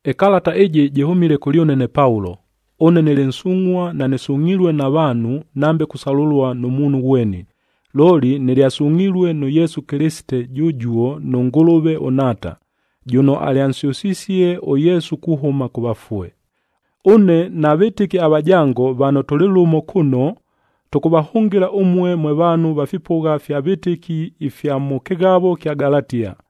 Ɨkalata ɨjɨ jɨhʉmile kʉlyʉne ne Paulo. Ʉne nɨlɨ nsungʼhua, nanɨsungʼhilue na vaanhu nambe kusalʉlua nʉ muunhu ghweni, looli nɨlyasungʼhilue nʉ Yesu Kɨlɨsite jʉjuo nʉ Ngʉlʉve ʉNhaata, jʉno alyansyʉsisie ʉYesu kuhʉma kʉ vafue. Ʉne na vɨtɨki avajango vano tʉlɨ lʉmo kʉno, tʉkʉvahʉngɨla ʉmue mwe vaanhu va fipʉgha fya vɨtɨki ifya mʉ kɨghavo ɨkya Galatia.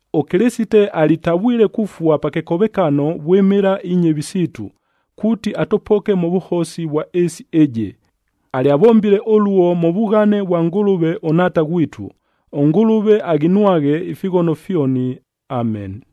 ɄKɨlɨsite alitavwile kufua pa kɨkovekano vwɨmɨla inyɨvi siitu, kuuti atʉpoke mʉ vʉhosi vwa ɨɨsi ɨjɨ. Alyavombile ʉluo mʉ vughane vwa Ngʉlʉve ʉNhaata ghwitu. ɄNgʉlʉve aghinwaghe ifighono fyoni. Ameni.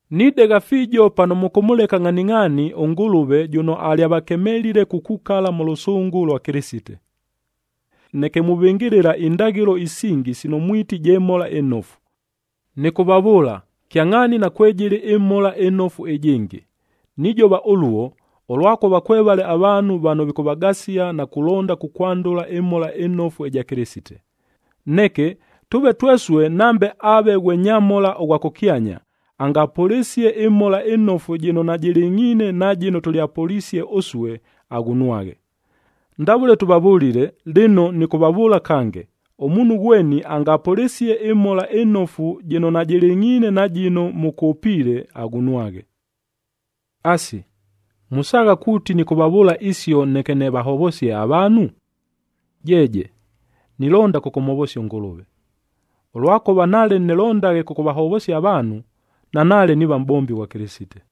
Nidegha fiijo pano mʉkʉmʉleka ngʼhaningʼhaani ʉNgʉlʉve jʉno alyavakemelile kukukala mʉ lʉsʉngʉ lwa Kɨlɨsite, neke muvɨngɨlɨla indaghɨlo isingi sino mwiti je Mhola ɨNofu. Nɨkʉvavʉʉla, kyangʼhaani nakwejɨlɨ ɨMhola ɨNofu ɨjɨngɨ. Nijova ʉluo, ʉlwakʉva kwevale avaanhu vano vikʉvagasia na kulonda kukwandʉla ɨMhola ɨNofu ɨja Kɨlɨsite. Neke, tʉʉve twesue nambe aave ghwe nyamhola ʉghwa kʉkyanya, angapʉlɨsie ɨMhola ɨNofu jɨno najɨlɨngʼhiine na jɨno tʉlyapʉlisie ʉsue, aghunwaghe. Ndavʉle tʉvavʉlile, lɨno nɨkʉvavʉʉla kange, ʉmuunhu ghweni angapʉlɨsie ɨMhola ɨNofu jɨno najɨlɨngʼhiine na jɨno mʉkʉpiile, aghunwaghe. Asi, musaagha kuuti nɨkʉvavʉʉla isio neke nɨvahovosie avaanhu? Jeeje! Nilonda kʉkʉmhovosia ʉNgʉlʉve. Ʉlwakʉva nale nɨlondaghe kʉkʉvahovosia avaanhu, nanaale niiva mʼbombi ghwa Kɨlɨsite.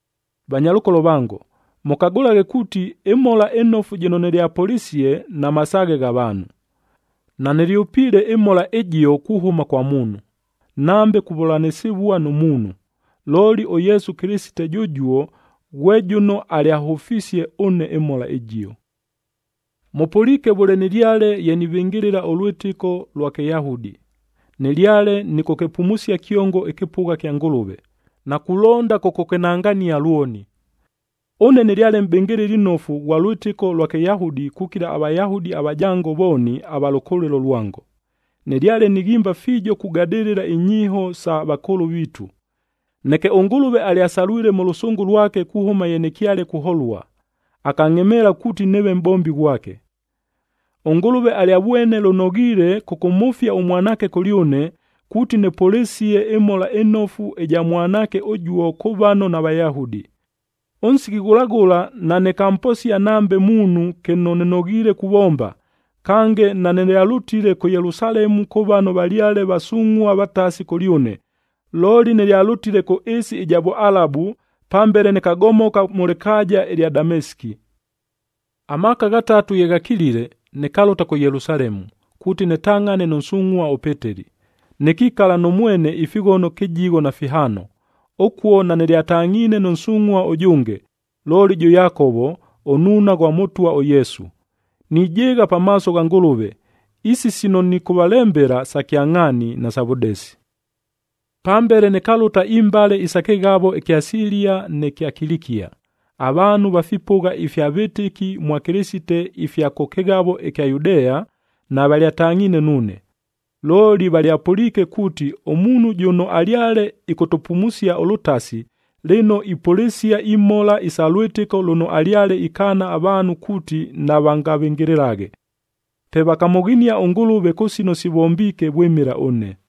Vanyalʉkolo vango, mʉkagʉlaghe kuuti, ɨMhola ɨNofu jɨno nɨlyapʉlisie namasaaghe gha vaanhu. Nanɨlyʉpiile ɨMhola ɨjio kuhʉma kwa muunhu, nambe kuvʉlanɨsɨvua nʉ muunhu, looli ʉYesu Kɨlɨsite jʉjuo ghwe jʉno alyahʉfisie ʉne ɨMhola ɨjio. Mʉpʉliike vʉle nɨlyale ye nivɨngɨlɨla ʉlwɨtɨko lwa Kɨyahudi. Nɨlyale nɨkʉkɨpumusia kyongo ɨkɨpʉgha kya Ngʉlʉve, na kulonda kʉkʉkɨnangania lwoni. Ʉne nɨlyale mʼbɨngɨlɨli nnofu ghwa lwɨtɨko lwa Kɨyahudi kukila aVayahudi avajango vooni ava lʉkʉlɨlo lwango. Nɨlyale nighimba fiijo kugadɨlɨla inyiiho isa vakʉʉlʉ viitu. Neke ʉNgʉlʉve alyasalwile mʉ lʉsʉngʉ lwake kuhʉma ye nɨkyale kuholua, akangʼhemeela kuuti nɨɨve mʼbombi ghwake. ɄNgʉlʉve alyavwene lʉnoghiile kʉkʉmhʉfia ʉMwanaakea kʉlyʉne, kuuti nɨpʉlɨsie ɨMhola ɨNofu ɨja Mwanaake ʉjuo kʉ vano naVayahudi. Ʉnsiki ghʉla ghʉla nanɨkamposia nambe muunhu kɨno nɨnoghiile kuvomba, kange nanɨlyalʉtile kʉ Yelusalemu kʉ vano valyale vasungʼhua vatasi kʉlyʉne, looli nɨlyalʉtile kʉ ɨɨsi ɨja Vʉalabu, pambele nɨkagomoka mʉ lɨkaaja ɨlya Damesiki. Amaaka ghatatu ye ghakilile, nɨkalʉta kʉ Yelusalemu kuuti nɨtangʼhane nʉ nsungʼhua ʉPeteli,b nɨkikala nʉ mwene ifighono kɨjigho na fihaano. Ʉkuo nanɨlyatangʼhiine nʉ nsungʼhua ʉjʉnge, looli jʉ Yakovo, ʉnnuuna ghwa Mʉtwa ʉYesu. Nijɨɨgha pamaaso gha Ngʉlʉve, isi sino nɨkʉvalembela, sa kyangʼhaani, nasa vʉdesi. Pambele nɨkalʉta imbale isa kɨghavo ɨkya Silia nɨ kya Kilikia. Avaanhu va fipʉgha ifya vɨtɨki mwa Kɨlɨsite ifya kʉ kɨghavo ɨkya Yudea, navalyatangʼhiine nuune. Looli valyapʉliike kuuti, “Ʉmuunhu jʉno alyale ɨkʉtʉpumusia ʉlʉtasi, lɨno ipʉlɨsia imhola isa lwɨtɨko lʉno alyale ikaana avaanhu kuuti navangavɨngɨlɨlaghe.” Pe vakamʉghinia ʉNgʉlʉve kʉ sino sivombiike vwɨmɨla ʉne.